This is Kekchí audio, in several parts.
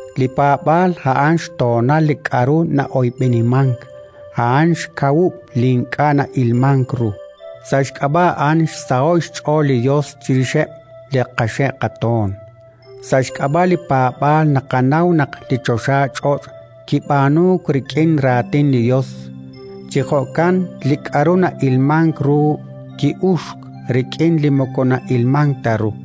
Li paab'aal a'an xtoonal li k'aru na'oyb'enimank; a'an xkawub' li ink'a' na'ilmank ru. Sa' xk'ab'a' a'an xsaho'k xch'ool li Yos chirixeb' li qaxe' qatoon. Sa' xk'ab'a' li paab'aal naqanaw naq li choxach'och' kib'aanuuk rik'in raatin li Yos. Chi jo'kan li k'aru na'ilmank ru ki'uxk rik'in li moko na'ilmank ta ru.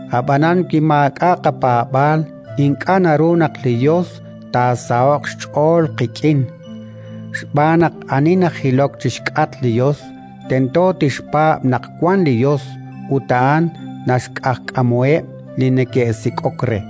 Ab'anan wi maak'a' qapaab'aal, ink'a' naru naq li Yos taasaho'q xch'ool qik'in, xb'aan naq ani najilok chi xk'atq li Yos tento tixpaab' naq wank li Yos ut a'an naxq'ajkamuheb' li neke'sik'ok re.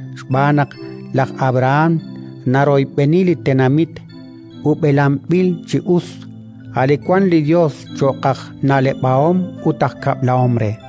Xb'aan naq laj Abrahán naroyb'eni li tenamit ub'elanb'il chi us, a' li wank li Yos cho'q aj na'leb'ahom ut aj kab'lahom re.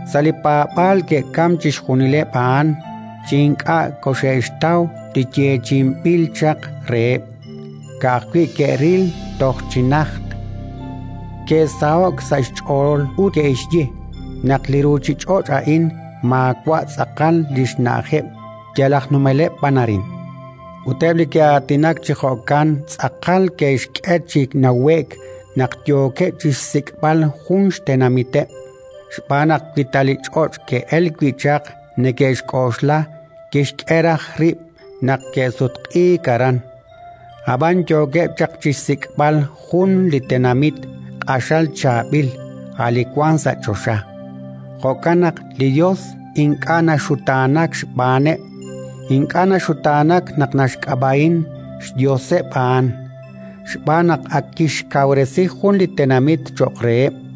Sa' li paab'aal ke'kamk chixjunileb' a'an, chi ink'a' koxe'xtaw li yeechi'inb'il chaq reheb': ka'ajwi' ke'ril toj chi najt, ke'saho'k sa' xch'ool ut ke'xye naq li ruuchich'och' a'in maawa' tz'aqal li xna'ajeb', yal aj numeleb' b'an arin. Ut eb' li ke'aatinak chi jo'kan tz'aqal ke'xk'e chi nawe'k naq yookeb' chi xsik'b'al jun xtenamiteb'. Xb'aan naq, wi ta li ch'och' ke'elk wi' chaq neke'xk'oxla, kixk'e raj rib' naq ke'sutq'iik aran. Ab'an yookeb' chaq chi xsik'b'al jun li tenamit q'axal chaab'il, a' li wank sa' choxa. Jo'kan naq li Yos ink'a' naxutaanak xb'aaneb', ink'a' naxutaanak naq naxk'ab'a'in “xYoseb' a'an”, xb'aan naq ak kixkawresi jun li tenamit cho'q reheb'.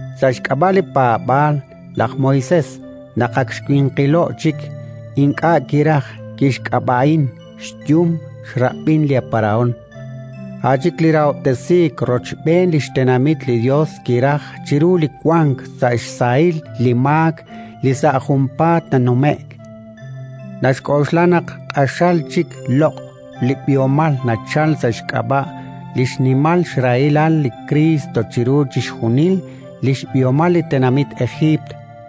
Sa' xk'ab'a' li paab'aal laj Moisés, naq ak xwinqilo'k chik, ink'a' kiraj kixk'ab'a'in xyum xrab'in laj Parahón; a' chik li rahob'tesiik rochb'een li xtenamit li Yos kiraj chiru li wank sa' xsahil li maak li sa' junpaat nanume'k. Naxk'oxla naq q'axal chik loq' li b'ihomal nachalk sa' xk'ab'a' li xnimal xrahilal li Kriist chiru chixjunil li xb'ihomal li tenamit Ejiipt,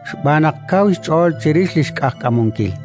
xb'aan naq kaw xch'ool chirix li xq'ajkamunkil.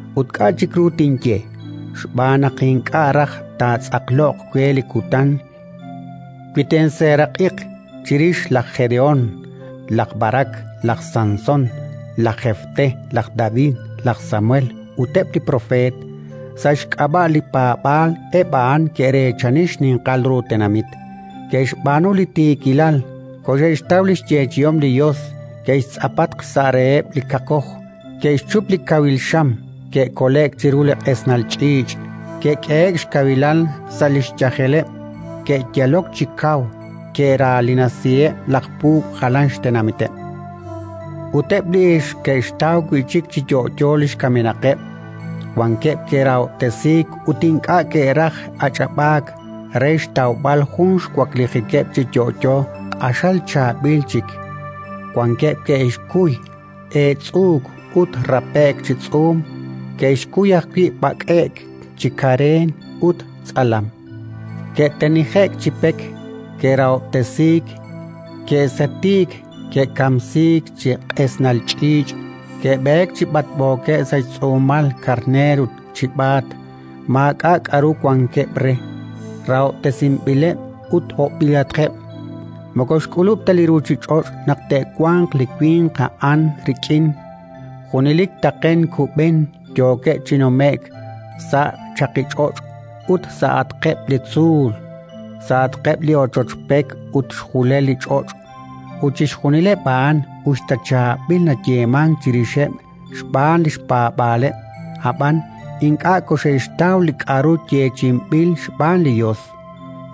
Ut k'a' chik ru tinye? Xb'aan naq ink'a' raj taatz'aqloq we li kutan, wi tinseeraq'iq chirix laj Jedehón, laj Barak, laj Sansón, laj Jefté, laj David, laj Samuel ut eb' li propeet. Sa' xk'ab'a' li paab'aal eb' a'an ke'reechani xninqal ru tenamit, ke'xb'aanu li tiikilal, koxe'xtaw li xyeechi'om li Yos, ke'xtz'apatq xsa' reheb' li kaqkoj, ke'xchup li kawil xam, ke'kole'k chiru li q'esnal ch'iich', ke'k'ehe'k xkawilal sa' li xyajeleb', ke'yalok chi kaw, ke'raanilasiheb' laj puub' jalan xtenamiteb'; ut eb' li ixq ke'xtaw wi' chik chi yo'yo li xkamenaqeb'. Wankeb' ke'rahob'tesiik ut ink'a' ke'raj ach'ab'aak, re xtawb'al jun xwaklijikeb' chi yo'yo q'axal chaab'il chik; wankeb' ke'xkuy eetz'uuk ut rape'k chi tz'uum; ke'xkuy ajwi' b'ak'e'k chi kareen ut tz'alam; ke'tenije'k chi pek, ke'rahob'tesiik, ke'sete'k, ke'kamsiik chi q'esnal ch'iich'; ke'b'eek chi b'atb'ookeb' sa' xtz'uumal karneer ut chib'aat. Maak'a' k'aru wankeb' re, rahob'tesinb'ileb' ut hob'b'ilatqeb' (moko xk'ulub' ta li ruuchich'och' naq te'wanq li winq a'an rik'in); junelik taqen kub'en yookeb' chi nume'k sa' chaqich'och' ut sa'atqeb' li tzuul, sa'atqeb' li ochoch pek ut xjulel li ch'och'. Ut chixjunileb' a'an, us ta chaab'il nayeemank chirixeb' xb'aan li xpaab'aaleb', ab'an ink'a' koxe'xtaw li k'aru yeechi'inb'il xb'aan li Yos.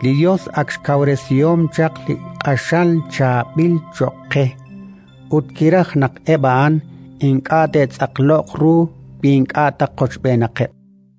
Li Yos ak xkawresihom chaq li q'axal chaab'il cho'q qe, ut kiraj naq eb' a'an ink'a' te'tz'aqloq ru wi ink'a' ta qochb'eenaqeb'.